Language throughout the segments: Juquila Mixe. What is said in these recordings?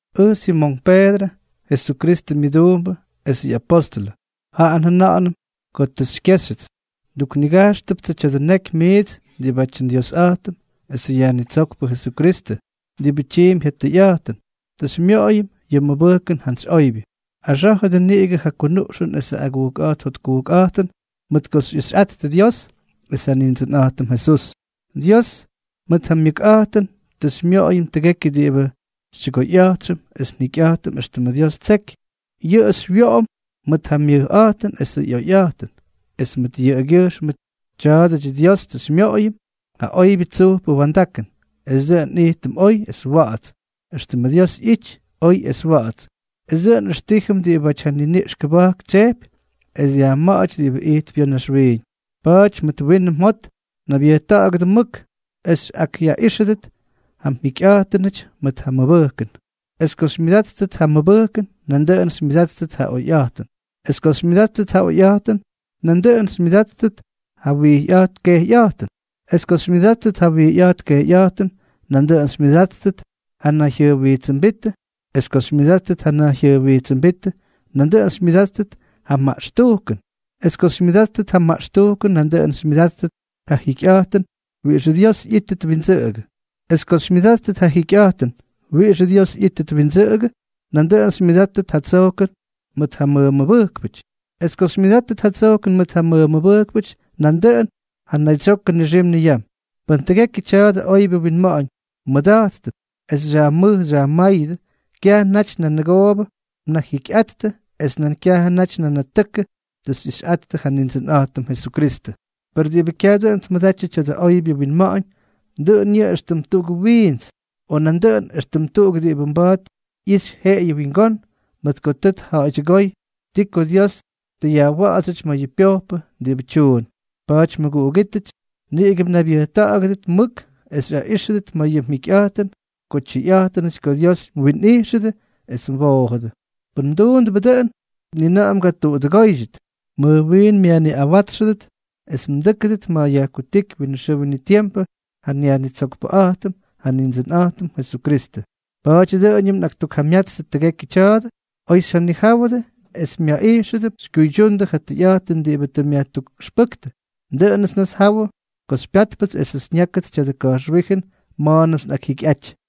Ʉj Simonk Peedrʉ, Jesukristʉ myʉduumbʉ esʉ ꞌyapóstʉlʉ, jaꞌa njʉna̱ꞌa̱nʉm ko tʉ xykyéxyʉts. Nduknigajxtʉptsʉ tya̱dʉ neky miits diꞌibátyʉ nDiosꞌa̱jtʉm esʉ Yajnitsókpʉ Jesukristʉ, diꞌibʉ tyiimpy ja tʉyꞌa̱jtʉn, tʉ xymyoꞌoyʉm yʉ mʉbʉjkʉn jantsy oybyʉ. Axá̱jʉdʉ niꞌigʉ ja kunuꞌxʉn esʉ agujkꞌa̱jt jotkujkꞌa̱jtʉn mʉt ko xyꞌixyꞌattʉ Dios es ja Nindsʉnꞌa̱jtʉm Jesús. Dios mʉt ja myʉkꞌa̱jtʉn tʉ xymyoꞌoyʉm tʉgekyʉ diꞌibʉ xytyʉgoyꞌa̱jtxʉm es njikyꞌa̱jtʉm éxtʉmʉ Dios ttseky, yʉꞌʉ xywyoꞌom mʉt ja myʉjꞌa̱jtʉn esʉ ꞌyoyꞌa̱jtʉn. Es mʉt yʉꞌʉgyʉjxmʉ tya̱a̱dʉdyʉ Dios tʉ xymyoꞌoyʉm ja oybyʉ tsujpʉ wa̱ndakʉn, es dʉꞌʉn nꞌijtʉm oy es wa̱ꞌa̱ts, éxtʉmʉ Dios ꞌyity oy es wa̱ꞌa̱ts, es dʉꞌʉn nꞌʉxtíjʉm diꞌibáty ja niniꞌx kʉba̱jk tsyejpy es dyajma̱ꞌa̱ty diꞌibáty ijtp ya̱ naxwiiñ. Pa̱a̱ty mʉt winʉ mjot naybyʉjta̱ꞌa̱gʉdʉ mʉk, es xyꞌakꞌyaꞌíxʉdʉt ja mjikyꞌa̱jtʉnʉty mʉt ja mmʉbʉjkʉn; es ko xymyʉdáttʉt ja mʉbʉjkʉn, nandʉꞌʉn xymyʉdáttʉt ja oyjyaꞌayꞌa̱jtʉn; es ko xymyʉdáttʉt ja oyjyaꞌayꞌa̱jtʉn, nandʉꞌʉn xymyʉdáttʉt ja wijyꞌa̱jt kejyꞌa̱jtʉn; es ko xymyʉdáttʉt ja wijyꞌa̱jt kejyꞌa̱jtʉn, nandʉꞌʉn xymyʉdáttʉt ja nayjyʉjwijtsʉmbítʉ; es ko xymyʉdáttʉt ja nayjyʉjwijtsʉmbítʉ, nandʉꞌʉn xymyʉdáttʉt ja maꞌxtujkʉn; es ko xymyʉdáttʉt ja maꞌxtujkʉn, nandʉꞌʉn xymyʉdáttʉt ja jikyꞌa̱jtʉn wiꞌixʉ Dios ꞌyítʉt windsʉꞌʉgʉ; es ko xymyʉdáttʉt ja jikyꞌa̱jtʉn wiꞌixʉ Dios ꞌyítʉt windsʉꞌʉgʉ, nandʉꞌʉn xymyʉdáttʉt ja tsojkʉn mʉt ja mmʉmʉbʉjkpʉty; es ko xymyʉdáttʉt ja tsojkʉn mʉt ja mmʉmʉbʉjkpʉty, nandʉꞌʉn ja naydsyokʉ nixim niyam. Pʉn tʉgekyʉ tya̱dʉ oybyʉ winma̱ꞌa̱ñ mmʉda̱jttʉp es xyajmʉj xyajmáyʉdʉ, kyajʉ naty nʉgoobʉ mnajikyꞌattʉ es nan kyajʉ naty nanatʉkʉ tʉ xyꞌixyꞌattʉ ja Nindsʉnꞌa̱jtʉm Jesukristʉ. Per diꞌibʉ kyaj dʉꞌʉn tmʉdatyʉ tya̱dʉ oybyʉ winma̱ꞌa̱ñ, dʉꞌʉn yʉꞌʉ éxtʉm tuꞌugʉ wiints, o nandʉꞌʉn éxtʉm tuꞌuk diꞌibʉ mba̱a̱t ꞌyixy jeꞌeyʉ wingón, mʉt ko tʉ tja̱ꞌa̱ydyʉgóy ti ko Dios tʉ yajwa̱ꞌa̱dsyʉty ma̱ yʉ pyojpʉ diꞌibʉ tyuun. Pa̱a̱ty mʉguꞌugítʉty, niꞌigʉ mnaybyʉjta̱ꞌa̱gʉdʉ mʉk es xyaꞌíxʉdʉt ma̱ yʉ mjikyꞌa̱jtʉn ko tyʉyꞌa̱jtʉnʉty ko Dios mwinꞌijxʉdʉ es mwoojʉdʉ. Pʉn mduundʉbʉ dʉꞌʉn, ni na̱ꞌa̱ mgatuꞌudʉgóydyʉt, mʉj wiin myajniꞌawátsxʉdʉt es mdʉ́kʉdʉt ma̱ yajkutíky winʉ xʉʉ winʉ tiempʉ ja nYajnitsokpʉꞌa̱jtʉm, ja Nindsʉnꞌa̱jtʉm Jesukristʉ. Pa̱a̱ty dʉꞌʉñʉm nꞌaktukjamyatstʉ tʉgekyʉ tya̱a̱dʉ, oy xyjanijáwʉdʉ es myaꞌijxʉdʉp xykyuydyundʉ ja tʉyꞌa̱jtʉn diꞌibʉ tʉ myajtukꞌʉxpʉ́ktʉ. Dʉꞌʉnʉts nnasjawʉ ko xypyátpʉts esʉts nyákʉt tya̱dʉ ka̱jxwíjʉn ma̱a̱nʉmts nꞌakyjyikyꞌaty.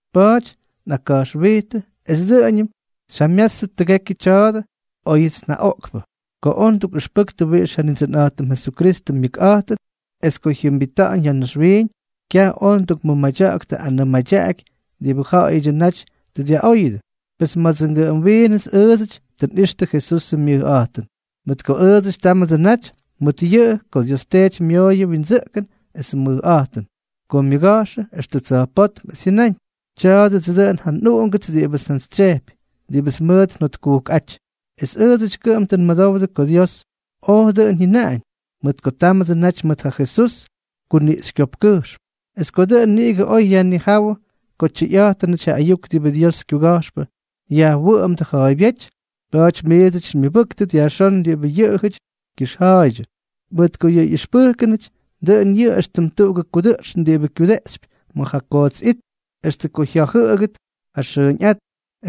Pa̱a̱ty nꞌakka̱jxwijtʉ es dʉꞌʉñʉm xyjamyátstʉt tʉgekyʉ tya̱a̱dʉ óyʉts njaꞌoꞌkpʉ. Ko oj ndukꞌʉxpʉktʉ wiꞌix ja Nindsʉnꞌa̱jtʉm Jesukristʉ myʉkꞌa̱jtʉn es ko jyʉmbita̱ꞌa̱ñ ya̱ naxwiiñ, kyaj oj ndukmʉmadya̱ꞌa̱ktʉ anʉʉ madyaꞌaky diꞌibʉ ja̱ꞌa̱yʉdyʉ naty tʉ dyaꞌóyʉdʉ, pes mʉdʉdsʉ ngʉꞌʉm wiinʉts ʉʉdsʉty tʉ nꞌixtʉ Jesusʉ myʉjꞌa̱jtʉn. Mʉt ko ʉʉdsʉty támʉdsʉ naty mʉt yʉꞌʉ ko Dios Teety myooyʉ windsʉꞌkʉn esʉ mʉjꞌa̱jtʉn, ko myʉga̱jxʉ extʉ tsa̱jpótm, es jyʉnáñ: “Tya̱a̱dʉdsʉ dʉꞌʉn ja nꞌUꞌungʉts diꞌibʉts njantsytsyejpy, diꞌibʉts mʉʉt njotkujkꞌáty.” Es ʉʉdsʉty kʉꞌʉm tʉ nmʉdowdʉ ko Dios oj dʉꞌʉn jyʉnaꞌañ, mʉt ko támʉdsʉ naty mʉt ja Jesús kuniꞌxykyopkkʉjxm. Es dʉꞌʉn niꞌigʉ oy yajnijáwʉ ko tyʉyꞌa̱jtʉnʉty ja ayuk diꞌibʉ Diosʉ kyuga̱jxpʉ yajwʉꞌʉmdʉ ja̱a̱ybyéty. Pa̱a̱ty miits xymyʉbʉ́ktʉt yajxón diꞌibʉ yʉꞌʉjʉty kyʉxja̱a̱ydyʉ, mʉt ko yʉ ꞌyʉxpʉjkʉnʉty, dʉꞌʉn yʉꞌʉ éxtʉm tuꞌugʉ kudʉꞌxn diꞌibʉ kyudeꞌxypy ma̱ ja koots it extʉ ko jya̱jʉꞌʉgʉt ja xʉʉñꞌát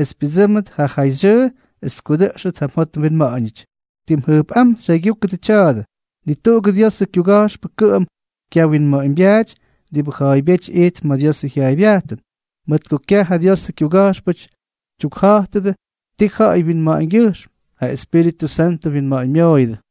es pyʉdsʉ́mʉt ja jayxyʉʉ es tkudʉꞌxʉt ja mjot mwinma̱ꞌa̱ñʉty. Tim jʉjpꞌám xyjaygyúkʉdʉ tya̱a̱dʉ: Ni tuꞌugʉ Diosʉ kyuga̱jxpʉ kʉꞌʉm kyawinma̱ꞌa̱ñbyaaty diꞌibʉ ja̱a̱ybyéty ijtp ma̱ Diosʉ jyaaybyajtʉn, mʉt ko kyaj ja Diosʉ kyuga̱jxpʉty tyukja̱jtʉdʉ tii ja̱ꞌa̱y wyinma̱ꞌa̱ñgyʉjxm, ja Espíritʉ Santʉ winma̱ꞌa̱ñmyooyʉdʉ.